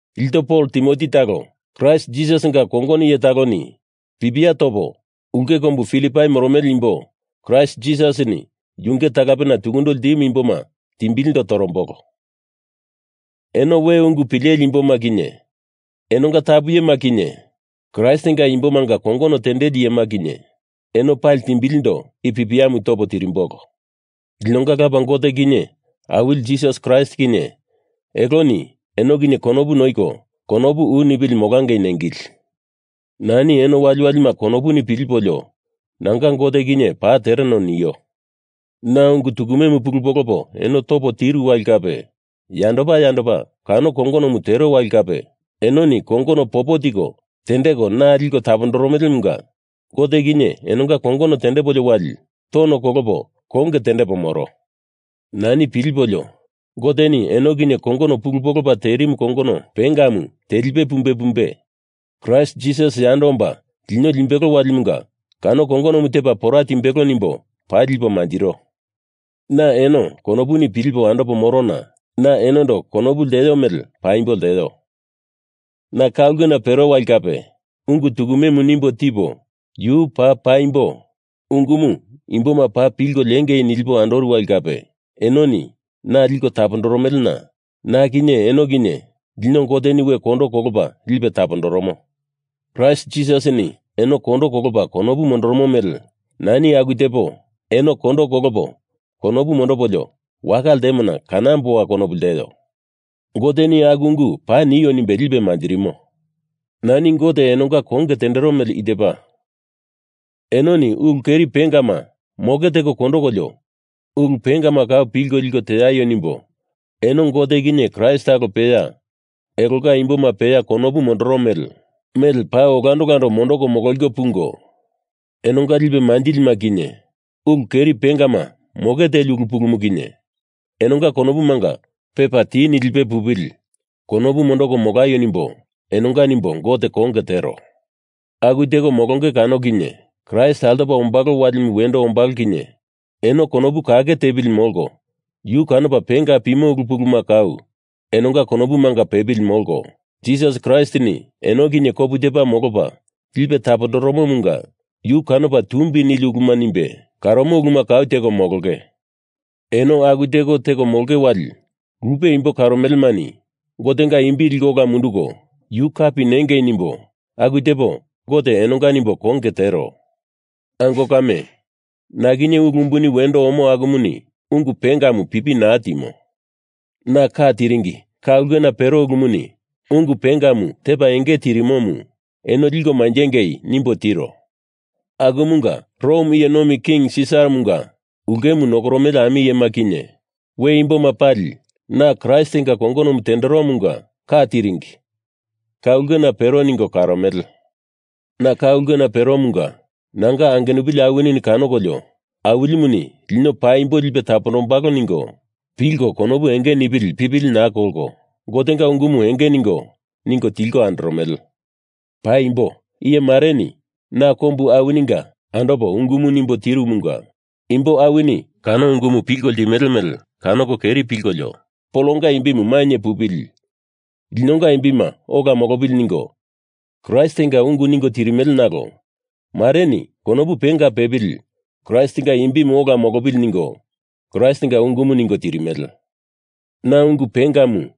Ilto Pol Timoti talo, Kraist Jisasinga kongono iye taloni pipia topo, ulke kombu Filipai moromele imbo Kraist Jisasini yunge talapena tukundo ltimu imboma timbilindo torombolo. Eno we ungu pileli imboma kinye, enonga tapu iyema kinye, Kraistinga imbomanga kongono tendeli iyema kinye, eno pali timbilindo i pipiamu topo tirimbolo. Linonga Lapa Gote kinye Awili Jisas Kraist kinye, eloni eno kinye konopu noiko konopu u nipili molangei nengili. Nani eno waliwalima konopuni pilipolio nanga Gote kinye paa tereno nio. Na ungu tukumemu pulu polopo eno topo tiru wali kape yandopa yandopa kano kongonomu tero wali kape enoni kongono popo tiko tendeko na liko tapondoromelemunga Gote kinye enonga konge tendepolio wali tono kolopo konge tendepo moro. Nani pilipolio, Goteni eno kinye kongono pulu polopa terimu kongono pengamu telipe pumbe pumbe, Kraist Jisas yando omba lino limbelo walimunga kano kongonomu tepa pora timbelo nimbo paa lipo manjiro. Na eno konopuni pilipo andopo morona na enondo konopu lteo mele paimbo lteo. Na ka ulkena pero wali kape, ungu tukumemu nimbo tipo yu paa paimbo ungumu imboma paa pilko liengei nilipo andoru wali kape, enoni na liko tapondoromelena na kinye eno kinye lino Goteni we kondo kolopa lipe tapondoromo. Kraist Jisasini eno kondo kolopa konopu mondoromo mele nani aku tepo eno kondo kolopo konopu mondopolio waka ltemona kanamboa konopu lteo. Goteni aku ungu paa nio nimbe lipe manjirimo. Nani Gote enonga konge tendero mele i tepa: Enoni ulu keri pengama moke teko kondokolio ulu pengama kau pilko liko teaio nimbo eno Gote kinye Kraist talo peya elonga imboma peya konopu mondoromele mele paa olando olando mondoko mololiko pungo, enonga lipe manjilima kinye ulu keri pengama moke teli ulu pulumu kinye enonga konopumanga pepa ti nilipe pupili konopu mondoko molaio nimbo enonga nimbo Gote konge tero. Aku teko molonge kano kinye Kraist altopa ombalo walimu wendo ombalo kinye eno konopu kake tepili molko yu kanopa penga pimo ulu puluma kau enonga konopumanga pepili molko, Jisas Kraistini eno kinye kopu tepa molopa lipe tapondoromomunga yu kanopa tumbi nili uluma nimbe karomo uluma kau teko molonge. Eno aku teko teko molonge wali lupe imbo karomelemani Gotenga imbi liko ola munduko yu kapi nengei nimbo aku tepo Gote enonga nimbo konge tero. Ango kame, na kinye ulu umbuni wendo omo akumuni ungu pengamu pipi naa timo. Na ka tiringi ka ulkena pero ulumuni ungu pengamu tepa enge tirimomu eno liko manjengei nimbo tiro. Akumunga Rom iye nomi king Sisaramunga ulkemu nokoromele ami iyema kinye we imboma pali na Kraistinga kongonomu tenderomunga ka tiringi ka ulkena pero ningo karomele. Na ka ulkena peromunga nanga angenupili awinini kanokolio Awilimuni lino paimbo lipe tapondombalo ningo pilko konopu enge nipili pipili naa kolko Gotenga ungumu enge ningo ningo tilko andoromele. Paimbo, iye mareni na kombu awininga andopo ungumu nimbo tirumunga imbo awini kano ungumu pilko limele mele kanoko keri pilkolio Polonga imbimu mainye pupili, linonga imbima ola molopili ningo Kraistinga ungu ningo tirimele nalo mareni konopu penga pepili Kraistinga imbimu ola molopili ningo Kraistinga ungumu ningo tirimele. Na ungu pengamu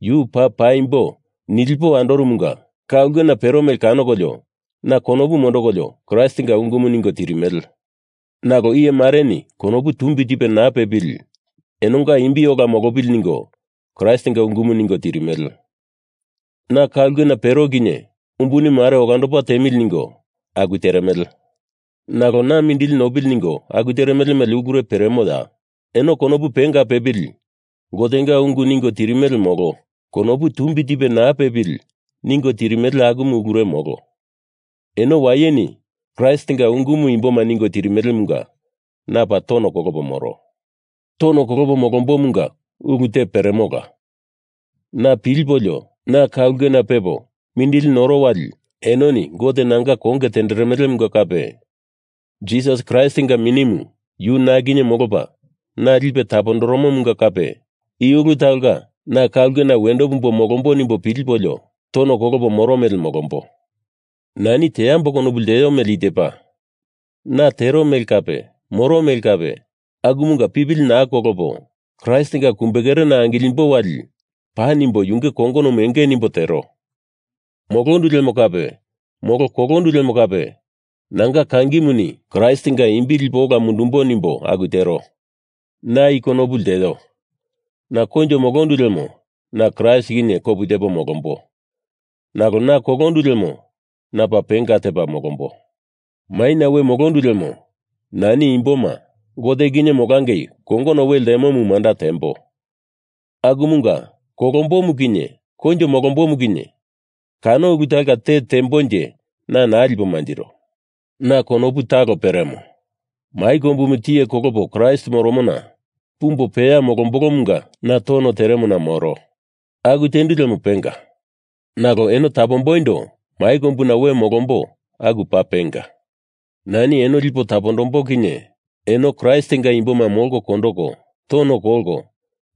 yu paa paimbo nilipo andoromunga ka ulkena pero mele kanokolio na konopu mondokolio Kraistinga ungumu ningo tirimele; nalo iye mareni konopu tumbi tipe naa pepili enonga imbi ola molopili ningo Kraistinga ungumu ningo tirimele. Na ka ulkena pero kinye umbuni mare olandopo tiemili ningo aku teremele. Nalo na mindili nopili ningo aku teremele mele ulure peremoya? Eno konopu penga pepili Gotenga ungu ningo tirimele molo konopu tumbi tipe naa pepili ningo tirimele akumu ulure molo. Eno wayeni Kraistinga ungumu imboma ningo tirimelemunga na paa tono kolopo moro. Tono kolopo molombomunga ulu te peremola. Na pilipolio, na ka ulkena pepo mindili noro wali enoni Gote nanga konge tenderemelemunga kape, Jisas Kraistinga Minimu yu na kinye molopa na lipe tapondoromomunga kape, i ulu talonga na ka ulkena wendo pumbo molombo nimbo pilipolio tono kolopo moro mele molombo. Nani teambo konopu lteo mele i tepa na tero mele kape moro mele kape akumunga pipili naa kolopo Kraistinga kumbekerena angilimbo wali paa nimbo yunge kongonomu enge nimbo tero. Molondu lemo kape molo kolondu lemo kape nanga kangimuni Kraistinga imbi lipo ola mundumbo nimbo aku tero. Na i konopu lteo. Na koinjo molondu lemo na Kraist kinye kopu tepo molombo nalo na kolondu lemo na paa penga tepa molombo. Maina we molondu lemo nani imboma Gote kinye molangei kongono we ltemomu manda tembo. Akumunga kolombomu kinye koinjo molombomu kinye kano ulu talonga te tembonje na naa lipo manjiro. Na konopu talo peremo. Mai kombumu tiye kolopo Kraist moromona pumbo peya molombolomunga na tono teremona moro. Aku tendu lemo penga. Nalo eno tapomboindo mai kombuna we molombo aku paa penga. Nani eno lipo tapondombo kinye eno Kraistinga imboma molko kondoko tono kolko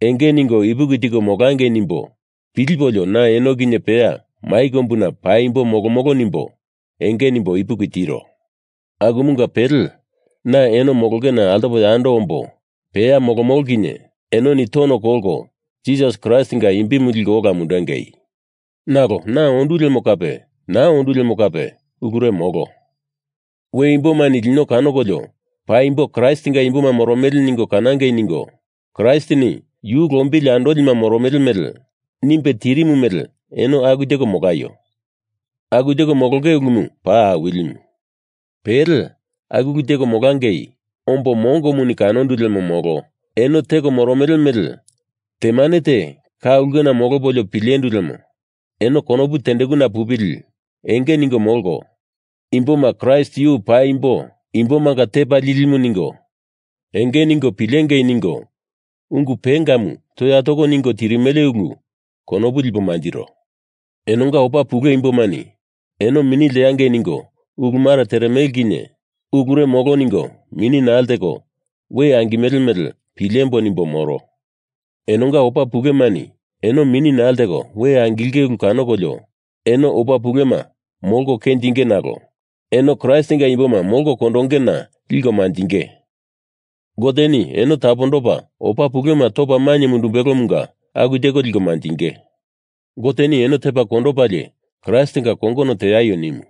enge ningo ipuki tiko molangei nimbo pilipolio na eno kinye peya mai kombuna paimbo molomolo nimbo enge nimbo ipuki tiro. Akumunga pele, na eno molongena altopo yando ombo peya molomolo kinye enoni tono kolko Kraist Jisasinga imbimu liko ola mundengei. Nalo, na ondu lemo kape naa ondu lemo kape ulure molo. We imbomani lino kanokolio paimbo Kraistinga imboma moromele ningo kanangei ningo Kraistini yu lombili andolima moromele mele nimbe tirimu mele eno aku teko molaio. Aku teko molonge ulumu paa awilimu. Pele, aku ulu teko molangei ombo mongoni kanondu lemo molo eno teko moromele mele temane te ka ulkena molopolio pilendu lemo eno konopu tendekuna pupili enge ningo molko, imboma Kraist yu paimbo imbomanga tepa lilimu ningo enge ningo pilengei ningo ungu pengamu toya toko ningo tirimele ulu konopu lipo manjiro. Enonga opa pule imbomani eno mini lteangei ningo ulu mare teremele kinye ulure molo ningo mini naa lteko we angimele mele pilembo nimbo moro. Enonga opa pulemani eno mini naa lteko we angilinge ulu kanokolio eno opa pulema molko kenjinge nalo eno Kraistinga imboma molko kondongena liko manjinge. Goteni eno tapondopa opa pulema topa mainye mundumbelomunga aku teko liko manjinge. Goteni eno tepa kondopalie Kraistinga kongono teaio nimu.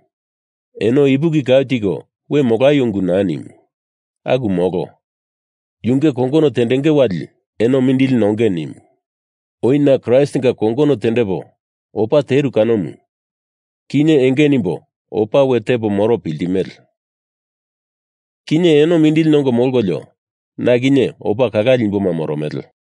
Eno ipuki kau tiko we molaio ungu naa nimu. Aku molo. Yunge kongono tendenge wali eno mindili nongei nimu. Oi na Kraistinga kongono tendepo opa teru kanomu, kinye enge nimbo opa we tepo moro piltimele. Kinye eno mindili nongo molkolio na kinye opa kalale imboma moromele.